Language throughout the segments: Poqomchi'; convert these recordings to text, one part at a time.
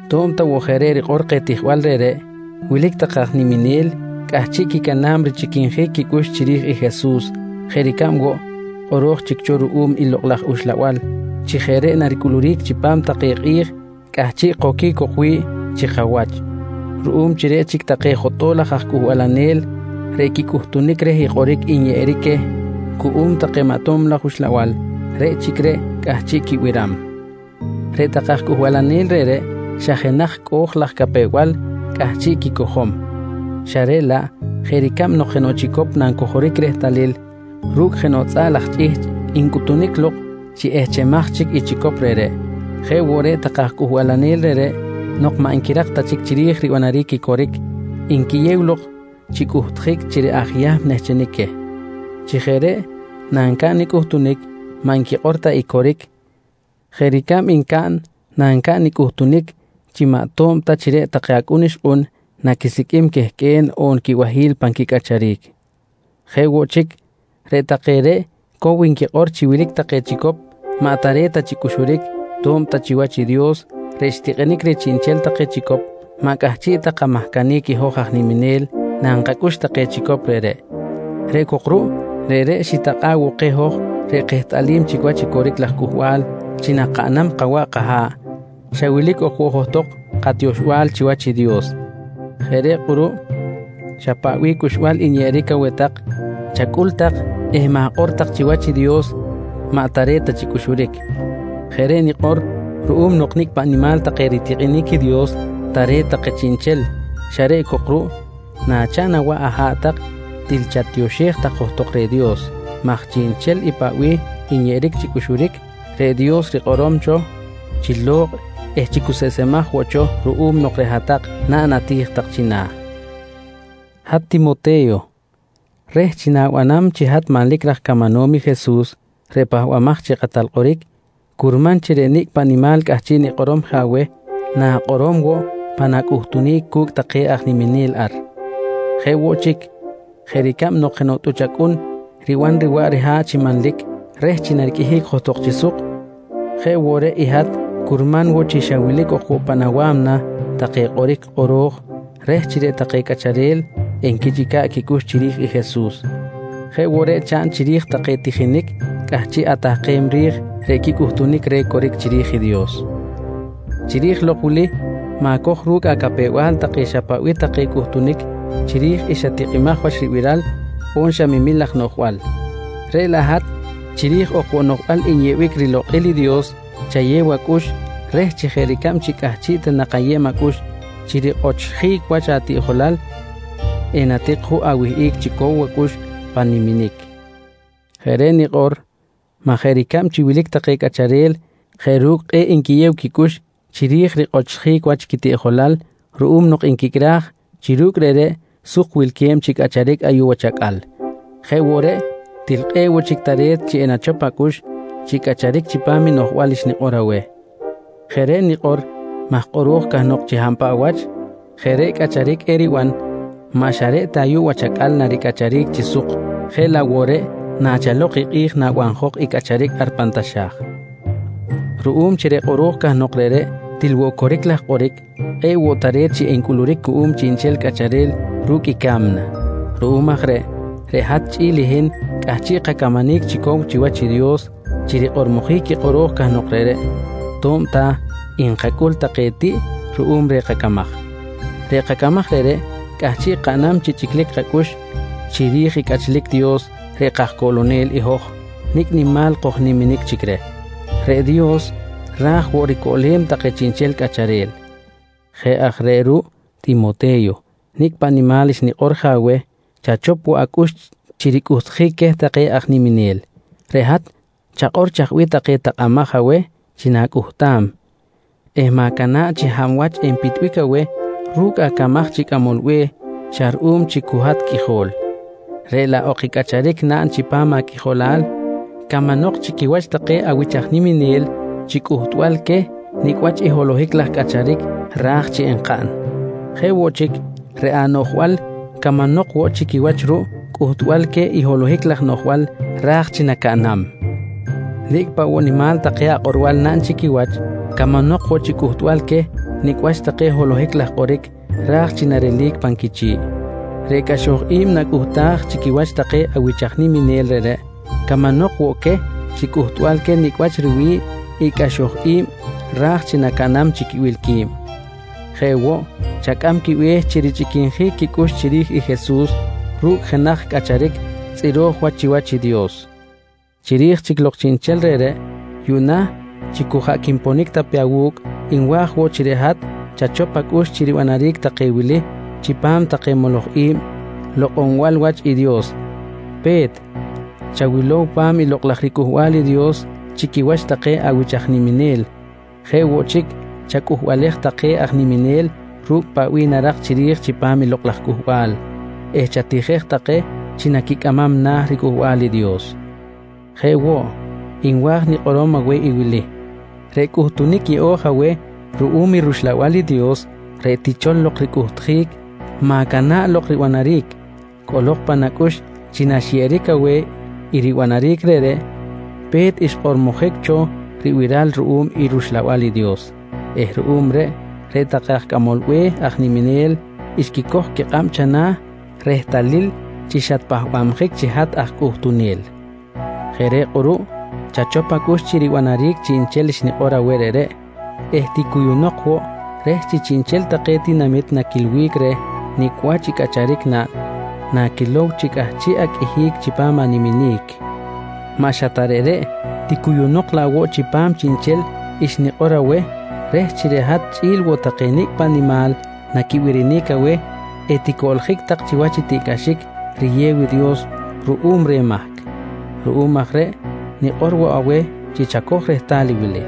To̱b ta woꞌ jeꞌ reꞌ rikꞌor keh tijbal reꞌreꞌ, wilic take aj niminel cꞌahchiꞌ quicana̱b richꞌiquinjic quicꞌux chiri̱j i Jesus jeꞌ ricab woꞌ kꞌoro̱j chic cho ruꞌum i Lokꞌ laj Uxlabal chi jeꞌ reꞌ naricꞌuluric chipam take kꞌi̱j cꞌahchiꞌ koquic cok wi̱ꞌ chi kawach ruꞌum chi reꞌ chic take jotꞌo̱l laj cꞌuhbalanel reꞌ quicꞌuhtunic reh i kꞌoric nyeꞌeric queh cuꞌum maꞌ tob laj uxlabal, reꞌ chic reꞌ cꞌahchiꞌ quibiram. Reꞌ take aj cꞌuhbalanel reꞌreꞌ xa jenaj cꞌo̱j laj capew-bal cꞌahchiꞌ quicojom, xa reꞌ laꞌ jeꞌ ricab nok jenoꞌ chicop nancojoric rehtalil ru̱cꞌ jenoꞌ tzꞌaꞌ laj chꞌihchꞌ ncꞌuhtunic lok chi ehchemaj chic i chicop reꞌreꞌ, jeꞌ woꞌ reꞌ take aj cꞌuhbalanel reꞌreꞌ nok maꞌ nquirak ta chic chiri̱j ribanaric i coric, nquiyew lok chi cꞌuhtjic chi reꞌ aj Yahm nehchenic queh. Chi jeꞌ reꞌ nancaꞌn i cꞌuhtunic, maꞌ nquikꞌor ta i coric jeꞌ ricab ncaꞌn nancaꞌn i cꞌuhtunic chi maꞌ to̱b ta chi reꞌ take acꞌun ixkꞌun naquisiqꞌuim quehqꞌue̱n on quibahi̱l pan quicꞌacharic. Jeꞌ woꞌ chic, reꞌ take reꞌ cow nquikꞌor chi wilic take chicop maꞌ tare̱t ta chi cꞌuxuric to̱b ta chiwach i Dios reꞌ xtikꞌinic reh chiꞌnchel take chicop, maꞌ cꞌahchiꞌ ta kamahcanic i hoj aj niminel nankacꞌux take chicop reꞌreꞌ. Reꞌ cok ruꞌ, reꞌreꞌ ritakꞌa̱ꞌ woꞌ keh hoj reꞌ kehtꞌalim chic wach i coric laj cꞌuhbal chi nankaꞌn kawaꞌ kaha̱ꞌ, xa wilic ok woꞌ johtok katioxbal chiwach i Dios. Jeꞌ reꞌ kꞌuruꞌ xa paꞌ bih cꞌuxbal nyeꞌeric aweh tak, chacꞌul tak eh ma̱kꞌor tak chi chiwach i Dios maꞌ tare̱t ta chi cꞌuxuric. Jeꞌ reꞌ nikꞌor ruꞌum nok nicꞌ paꞌ nimal take ritikꞌinic i Dios, tare̱t take chiꞌnchel xa reꞌ cok ruꞌ nachaꞌn awaꞌ aha̱ꞌ tak til chatioxej tak johtok reh Dios maj chiꞌnchel i paꞌ bih nyeꞌeric chi cꞌuxuric, reꞌ Dios rikꞌorom cho chi lo̱kꞌ eh chi cuseꞌsemaj woꞌ cho ruꞌum nok reꞌ hat-tak naꞌn ati̱j tak china̱. Hat Timote̱yo, reh chi na̱banam chi hat manlic raj camanom i Jesus reꞌ Pahbamaj chi Kꞌatal Kꞌoric, curman chi reꞌ nicꞌ paꞌ nimal cꞌahchiꞌ nikꞌorom je aweh na̱kꞌorom woꞌ pan acꞌuhtunic cu̱cꞌ take aj niminel ar. Jeꞌ woꞌ chic jeꞌ ricab nok jenoꞌ tꞌuch acꞌun riban riwaꞌ riha̱ꞌ chi manlic reh chi nariqꞌuihic johtok chi suk, jeꞌ woꞌ reꞌ i hat curman woꞌ chi xa wilic ok woꞌ pan awa̱mna take kꞌoric kꞌoro̱j reh chi reꞌ take cꞌacharel enquichꞌica̱ꞌ quicꞌux chiri̱j i Jesus. Jeꞌ woꞌ reꞌ chaꞌn chiri̱j take tijinic cꞌahchiꞌ atahkem ri̱j reꞌ quicꞌuhtunic reh coric chiri̱j i Dios. Chiri̱j lok wili ma̱coj ru̱cꞌ acapew-bal take xa paꞌ bih take cꞌuhtunic chiri̱j i xa tikꞌimaj wach ribiral on xa memil laj noꞌjbal, reꞌ laꞌ hat xa chiri̱j ok woꞌ noꞌjbal nyeꞌbic rilokꞌil i Dios chayew acꞌux reh chi jeꞌ ricab chi cꞌahchiꞌ ta nak ayeb acꞌux chi rikꞌochjic wach atiꞌjolal, enatik juꞌ awihꞌic chi cow acꞌux pan niminic. Jeꞌ reꞌ nikꞌor maj jeꞌ ricab chi wilic take cꞌacharel jeꞌ ru̱cꞌ kꞌe̱ꞌ nquiyew quicꞌux chiri̱j rikꞌochjic wach quitiꞌjolal ruꞌum nok nquicꞌraj chi ru̱cꞌ reꞌreꞌ suk wilque̱b chi cꞌacharic ayuꞌ wach acꞌal, jeꞌ woꞌ reꞌ til kꞌe̱ꞌ woꞌ chic tare̱t chi enachop acꞌux chi cꞌacharic chipam i noꞌjbal xnikꞌor aweh. Jeꞌ reꞌ nikꞌor maj kꞌoro̱j cahnok chi hab paꞌ wach jeꞌ reꞌ cꞌacharic eriban, maꞌ xa reꞌ ta ayuꞌ wach acꞌal naricꞌacharic chi suk jeꞌ laꞌ woꞌ reꞌ nachalok i kꞌi̱j nabanjok i cꞌacharic ar pan taxa̱j. Ruꞌum chi reꞌ kꞌoro̱j cahnok reꞌreꞌ til woꞌ coric laj kꞌoric, kꞌe̱ꞌ woꞌ tare̱t chi encꞌuluric cuꞌum chiꞌnchel cꞌacharel ru̱cꞌ i ca̱mna. Ruꞌum aj reꞌ, reꞌ hat chꞌi̱l i hin cꞌahchiꞌ kacamanic chi cow chiwach i Dios chi rikꞌormojic i kꞌoro̱j cahnok reꞌreꞌ to̱b ta nkacꞌul take tiꞌ ruꞌum reh kacamaj. Reꞌ kacamaj reꞌreꞌ cꞌahchiꞌ kaꞌnam chi chꞌiclic kacꞌux chiri̱j i cꞌachlic Dios reꞌ kajCoꞌlonel i hoj nicꞌ nimal kojniminic chic reh. Reꞌ Dios ra̱j woꞌ ricoꞌlem take chiꞌnchel cꞌacharel. Jeꞌ aj reꞌ ruꞌ Timote̱yo nicꞌ paꞌ nimal xnikꞌor je aweh chachop woꞌ acꞌux chi ricꞌuhtjic queh take aj niminel. Reꞌ hat chakꞌor chaj bih take takꞌamaj aweh chi na̱cꞌuhtam eh ma̱cana̱ꞌ chi hab wach enpitbic aweh ru̱cꞌ acamaj chi cꞌamol be̱h xa ruꞌum chi cu hat qꞌuijol, reꞌ laꞌ ok i cꞌacharic naꞌn chipam aqꞌuijolal camanok chi quiwach take awich aj niminel chi cꞌuhtbal queh nicꞌ wach i holohic laj cꞌacharic raj chi encaꞌn. Jeꞌ woꞌ chic, reꞌ anoꞌjbal camanok woꞌ chi quiwach ruꞌ cꞌuhtbal queh i holohic laj noꞌjbal ra̱j chi nacaꞌnam. Nicꞌ paꞌ woꞌ nimal take akꞌorbal naꞌn chi quiwach, camanok woꞌ chi cꞌuhtbal queh nicꞌ wach take holohic laj kꞌoric ra̱j chi narelic pan quichi̱ꞌ. Reꞌ cꞌaxoj i̱b nacꞌuhtaj chi quiwach take awich aj niminel reꞌreꞌ, camanok woꞌ queh chi cꞌuhtbal queh nicꞌ wach riwi̱ꞌ i cꞌaxoj i̱b ra̱j chi nacaꞌnam chi quibil qui̱b. Jeꞌ woꞌ chacꞌam quibe̱h chi richꞌiquinjic quicꞌux chiri̱j i Jesus ru̱cꞌ jenaj cꞌacharic tzꞌiro̱j wach chiwach i Dios. Chiri̱j chic lok chiꞌnchel reꞌreꞌ, yuꞌna chi cu jaꞌ quinponic ta pe awu̱cꞌ nwa̱j woꞌ chi reꞌ hat chachop acꞌux chi ribanaric take wili chipam take moloj i̱b reh lokꞌonbal wach i Dios: Pe̱t, chawilow pa̱m Lokꞌ laj riCꞌuhbal i Dios chi quiwach take awich aj niminel. Jeꞌ woꞌ chic, chacꞌuhbalej take aj niminel ru̱cꞌ paꞌ bih narak chiri̱j chipam Lokꞌ laj Cꞌuhbal eh chatijej take chi naquicꞌamam na̱ riCꞌuhbal i Dios. Jeꞌ woꞌ, nwa̱j nikꞌorom aweh i wili: Reꞌ cꞌuhtunic yeꞌo̱j aweh ruꞌum i rUxlabal i Dios reꞌ tichol lok ricꞌuhtjic, ma̱cana̱ꞌ lok ribanaric. Cꞌolok pan acꞌux chi naxyeꞌeric aweh i ribanaric reꞌreꞌ, pe̱t xkꞌormojic cho ribiral ruꞌum i rUxlabal i Dios eh ruꞌum reꞌ, reꞌ take aj cꞌamol be̱h aj niminel xquicoj quikꞌab chana̱ rehtalil chi xatpahbabjic chi hat aj cꞌuhtunel. Jeꞌ reꞌ kꞌuruꞌ chachop acꞌux chi ribanaric chiꞌnchel xnikꞌor aweh reꞌreꞌ eh ticuyunok woꞌ reh chi chiꞌnchel take tinamit naquilbic reh nicꞌ wach i cꞌacharic naꞌn naquilow chi cꞌahchiꞌ aqꞌuihic chipam i niminic. Maꞌ xa reꞌ ta reꞌreꞌ, ticuyunok laꞌ woꞌ chipam chiꞌnchel xnikꞌor aweh reh chi reꞌ hat chꞌi̱l woꞌ take nicꞌ paꞌ nimal naquibirinic aweh eticoꞌljic tak chiwach i tiꞌcꞌaxic riyew i Dios ruꞌum reh mahc. Ruꞌum aj reꞌ nikꞌor woꞌ aweh chi chacoj rehtal i wili: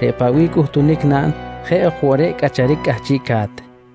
Reꞌ paꞌ bih cꞌuhtunic naꞌn jeꞌ ok woꞌ reꞌ cꞌacharic cꞌahchiꞌca̱t.